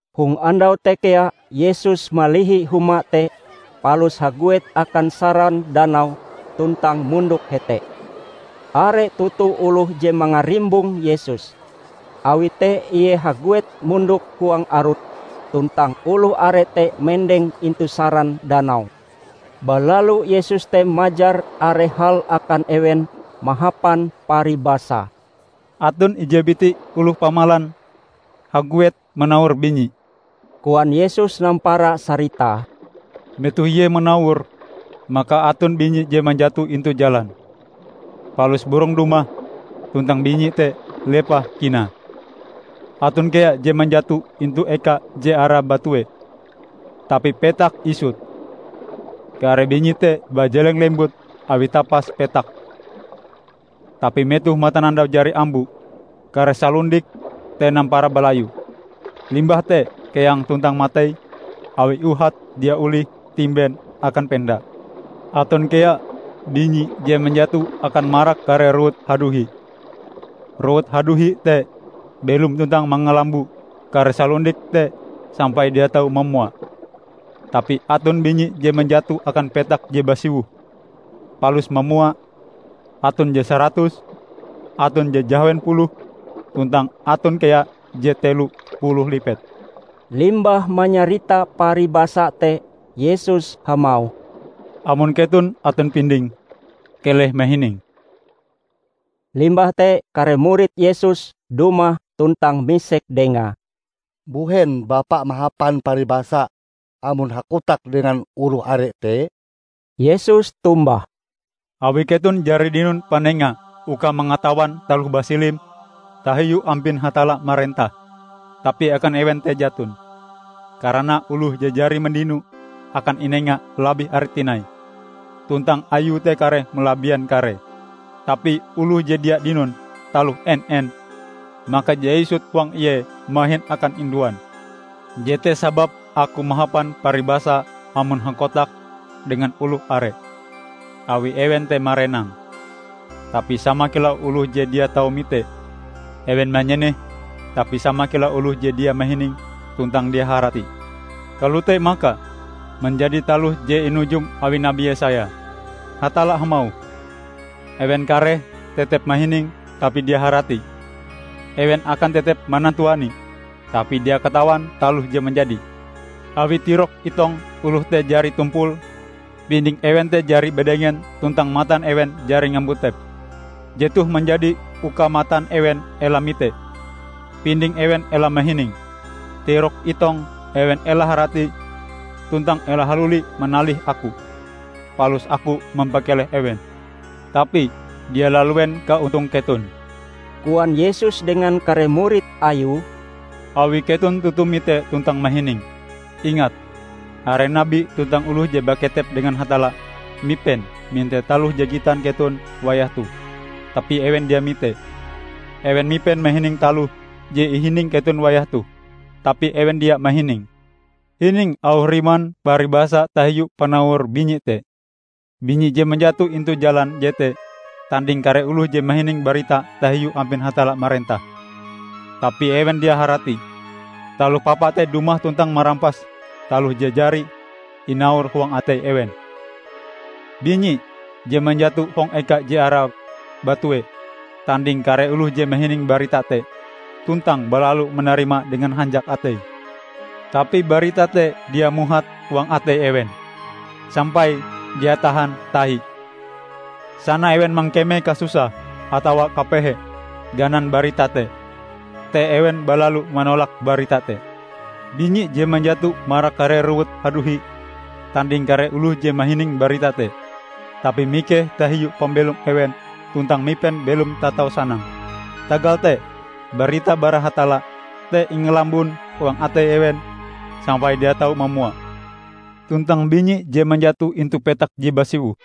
Hong andau te kea Yesus malihi huma te palus haguet akan saran danau tuntang mondok hete. Are toto oloh je mangarimbong Yesus, awi te Ie haguet mondok huang arut, tuntang oloh are te mendeng intu saran danau. Balalu Yesus te majar are hal akan ewen mahapan paribasa. "Aton ije biti oloh pamalan haguet manawor binyi," koan Yesus nampara saritae. "Metoh ie manawore, maka aton binyi je manjato intu jalan. Palus burong dumah tuntang binyi te lepah kinae. Aton kea je manjato intu eka je are batue, tapi petake isut. Kare binyi te bajeleng lembut awi tapas petake. Tapi metoh matanandau jari ambo, kare salundike te nampara balayu, limbah te keang tuntang matei awi uhate dia olih timben akan penda. Aton kea binyi je manjato akan marak kare rowut haduhi. Rowut haduhi te belom tuntang mangalambo kare salundike te sampai dia tau mamua. Tapi aton binyi je manjato akan petak je basiwoh, palus mamua; aton je saratus, aton je jahawen puluh, tuntang aton kea je telo puluh lipet." Limbah manyarita paribasa te Yesus hamauh, "Amon keton aton pinding, keleh mahining!" Limbah te kare murid Yesus dumah tuntang misek Dengae, "Mbuhen Bapa mahapan paribasa amon hakotak dengan oloh are te?" Yesus tombah, "Awi keton jari dinon panenga uka mangatawan taloh basilim tahiu ampin Hatalla marentah, tapi akan ewen te jaton. Karana oloh je jari mandino akan inenga labih are tinai, tuntang ayue te kareh malabien karee. Tapi oloh je dia dinon taloh en-en, maka je isut huang ie mahin akan induan. Jete sababe Aku mahapan paribasa amon hakotak dengan oloh are, awi ewen te marenang, tapi sama kilau oloh je dia tau mite; ewen manyeneh tapi sama kilau oloh je dia mahining tuntang dia haratie. Kalote maka, manjadi taloh je inujum awi Nabi Yesaya, 'Hatalla hamauh: Ewen kareh tetep mahining tapi dia haratie; Ewen akan tetep manantuanie tapi dia katawan taloh je manjadi Awi tirok itong oloh te jari tumpul, pinding ewen te jari badengen tuntang matan ewen jari ngambutep. Jetoh manjadi uka matan ewen ela mite, pinding ewen ela mahining, tirok itong ewen ela haratie tuntang ela haluli manalih Aku, palus Aku mampakeleh ewen.' " "Tapi dia laluen kaontong keton," koan Yesus dengan kare murid Ayue, "awi keton toto mite tuntang mahining. Ingat, are nabi tuntang oloh je baketep dengan Hatalla mipen mite taloh je gitan keton wayah toh, tapi ewen dia mitee. Ewen mipen mahining taloh je ihining keton wayah toh, tapi ewen dia mahininge." "Hining auh riman paribasa tahiu panawor binyi te. Binyi je manjato intu jalan jete tanding kare oloh je mahining barita tahiu ampin Hatalla marentah, tapi ewen dia haratie. Taloh Papa te dumah tuntang marampas taloh je jari inawor huang atei ewen. Binyi je manjato hong eka je are batue, tanding kare oloh je mahining barita te, tuntang balalu manarimae dengan hanjak ateie. Tapi barita te dia muhat huang atei ewen, sampai dia tahan tahi. Sana ewen mangkeme kasusah atawa kapehe ganan barita te, te ewen balalu manolak barita te. Binyi je manjato marak kare rowut haduhi, tanding kare oloh je mahining barita te, tapi mikeh tahiu pambelom ewen tuntang mipen belom tatau sanang. Tagal te barita bara Hatalla te ingalambon huang atei ewen sampai dia tau mamua. Tuntang binyi je manjato intu petak je basiwoh,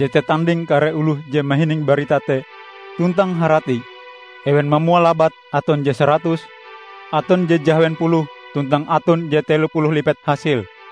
jete tanding kare oloh je mahining barita te tuntang haratie. Ewen mamua labat, aton je saratus, aton je jahawen puluh, tuntang aton je telo puluh lipet hasile."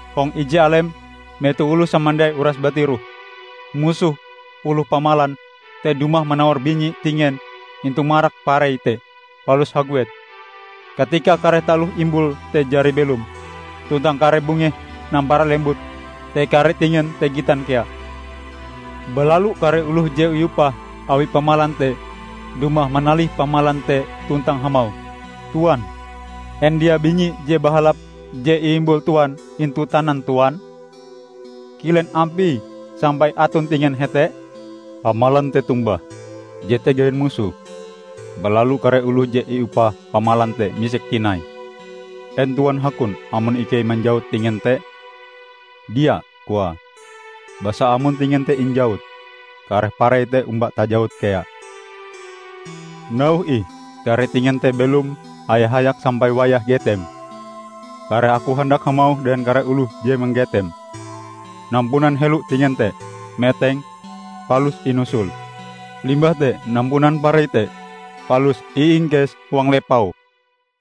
Hong ije alem, metoh oloh samandiai uras batiroh, musoh oloh pamalan te dumah manawor binyi tingen intu marak parei te, palus haguet. Katika kare taloh imbul te jari belom, tuntang kare bungehe nampara lembut, te kare tingen te gitan kea. Balalu kare oloh je iupah awi pamalan te dumah manalih pamalan te tuntang hamauh, 'Tuan, en dia binyi je bahalap je iimbul tuan intu tanan tuan? Kilen ampie sampai aton tingen hete?' Pamalan te tombah, 'Jete gawin musoh.' Balalu kare oloh je iupah pamalan te misek tinai, 'En tuan hakon amon ikei manjawut tingen te?' 'Dia,' koae, 'Basa amon tingen te injawut, kareh parei te omba tajawut kea. Nauhe ih kare tingen te belom haya-hayak sampai wayah getem. Kareh aku handak hamauh dengan kare oloh je manggetem: Nampunan helo tingen te, meteng, palus inusul. Limbah te nampunan parei te, palus iingkes huang lepau.' "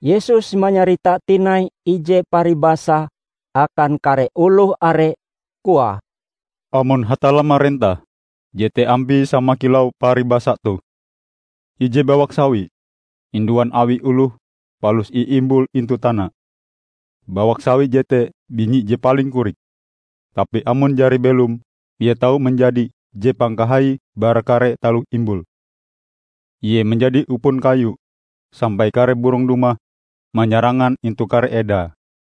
Yesus manyarita tinai ije paribasa akan kare oloh are, koae, "Amon Hatalla marentah, jete ampie sama kilau paribasa toh: Ije bawak sawi, induan awi oloh palus iimbule intu tanae. Bawak sawi jete binyi je paling korik. Tapi amon jari belom, ie tau manjadi je pangkahaie bara kare taloh imbul. Ie manjadi upon kayu, sampai kare burong dumah manyarangan intu kare edae."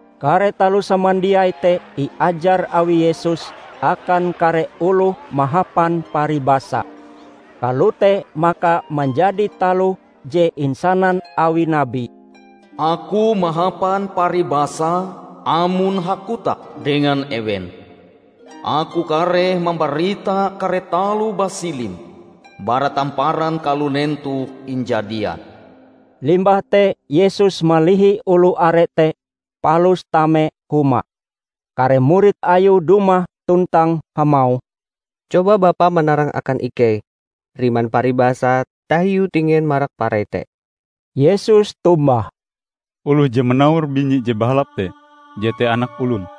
Kare taloh samandiai te iajar awi Yesus akan kare oloh mahapan paribasa. Kalote maka manjadi taloh je insanan awi nabi, "Aku mahapan paribasa amon hakotak dengan ewen; Aku kareh mambarita kare taloh basilim bara tamparan kalunen toh injadian." Limbah te Yesus malihi oloh are te palus tame huma. Kare murid Ayue dumah tuntang hamauh, "Coba Bapa manarang akan ikei riman paribasa tahiu tingen marak parei te." Yesus tombah, "Oloh je manawor binyi je bahalap te, jete Anak Olon.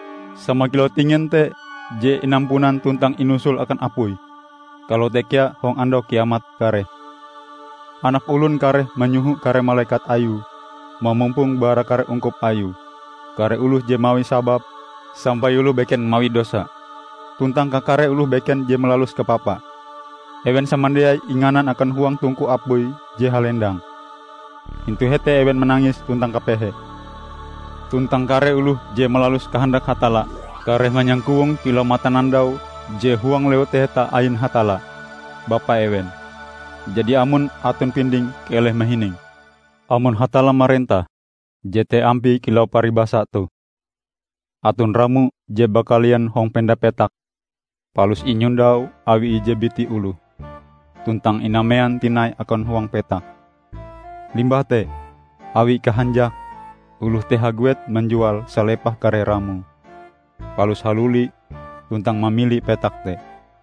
Sama kilau tingen te je inampunan tuntang inusul akan apui, kalote kea hong Andau Kiamat kareh. Anak Olon kareh manyoho kare malekat Ayue mamumpong bara kare ungkup Ayue kare oloh je mawi sabab sampai oloh beken mawi dosa, tuntang kakare oloh beken je malalus kapapa. Ewen samandiai inganan akan huang tungku apui je halendang: intu hete ewen manangis tuntang kapehe. Tuntang kare oloh je malalus kahandak Hatalla kareh manyangkowong kilau matanandau je huang Lewu Taheta ain Hatalla, Bapa ewen. Jadi amon aton pinding keleh mahining!" "Amon Hatalla marentah, jete ampie kilau paribasa toh: aton ramo je bakalian hong penda petak palus inyondau awi ije biti oloh, tuntang inamean tinai akan huang petak. Limbah te awi kahanjake, oloh te haguet manjual salepah kare ramoe, palus haluli tuntang mamili petak te."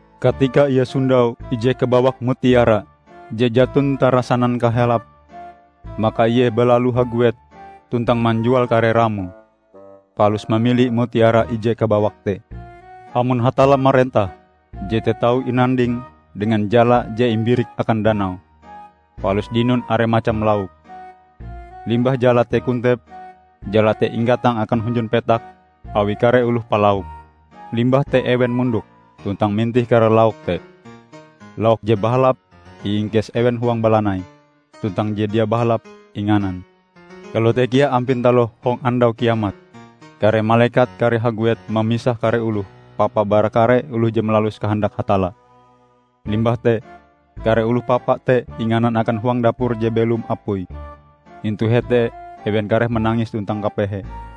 Katika ie sondau ije kabawak mutiara je jaton tarasanan kahalape, maka ie balalu haguet tuntang manjual kare ramoe, palus mamili mutiara ije kabawak te." "Amon Hatalla marentah, jete tau inanding dengan jala je imbirik akan danau, palus dinon are macam lauk. Limbah jala te kontep, jala te inggatang akan hunjun petak awi kare oloh palauk. Limbah te ewen mondok tuntang mintih kare lauk te: lauk je bahalap iingkes ewen huang balanai tuntang je dia bahalap inganan. Kalote kea ampin taloh hong Andau Kiamat, kare malekat kareh haguet mamisah kare oloh papa bara kare oloh je malalus kahandak Hatalla. Limbah te kare oloh papa te inganan akan huang dapur je belom apuie. Intu hete ewen kareh manangis tuntang kapehe."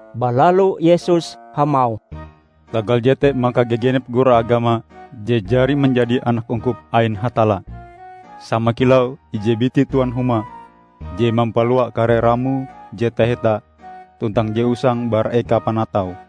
Balalu Yesus hamauh, "Tagal jete maka gagenep guru agama je jari manjadi anak ungkup ain Hatalla, sama kilau ije biti tuan huma je mampalua kare ramoe je taheta tuntang je usang bara eka panataue."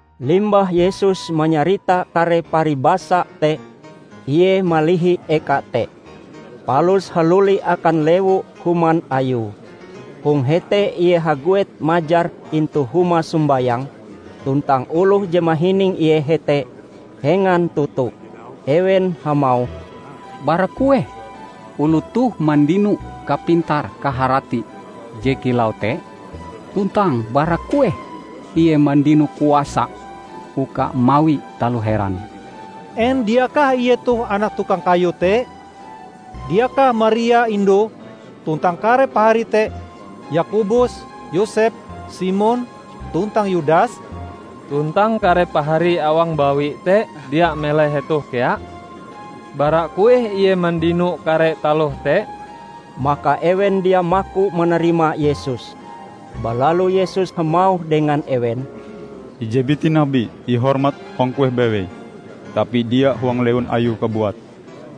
Limbah Yesus manyarita kare paribasa te, Ie malihi eka te, palus haluli akan lewu human Ayue. Hong hete Ie haguet majar intu huma sombayang, tuntang oloh je mahining Ie hete, hengan toto. Ewen hamauh, "Bara kueh oloh toh mandino kapintar kaharati je kilau te? Tuntang bara kueh Ie mandino kuasa uka mawi taloh heran? En diakah Ie toh anak tukang kayu te? Diakah Maria indue; tuntang kare paharie te Yakobus, Yosep, Simon tuntang Yudas? Tuntang kare paharie awang bawi te dia melai hetoh kea? Bara kueh Ie mandino kare taloh te?" Maka ewen dia maku manarima Yesus. Balalu Yesus hamauh dengan ewen, "Ije biti nabi ihormat hong kueh bewei, tapi dia huang lewun ayue kabuat."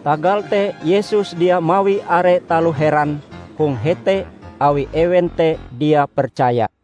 Tagal te Yesus dia mawi are taloh heran hong hete awi ewen te dia percaya.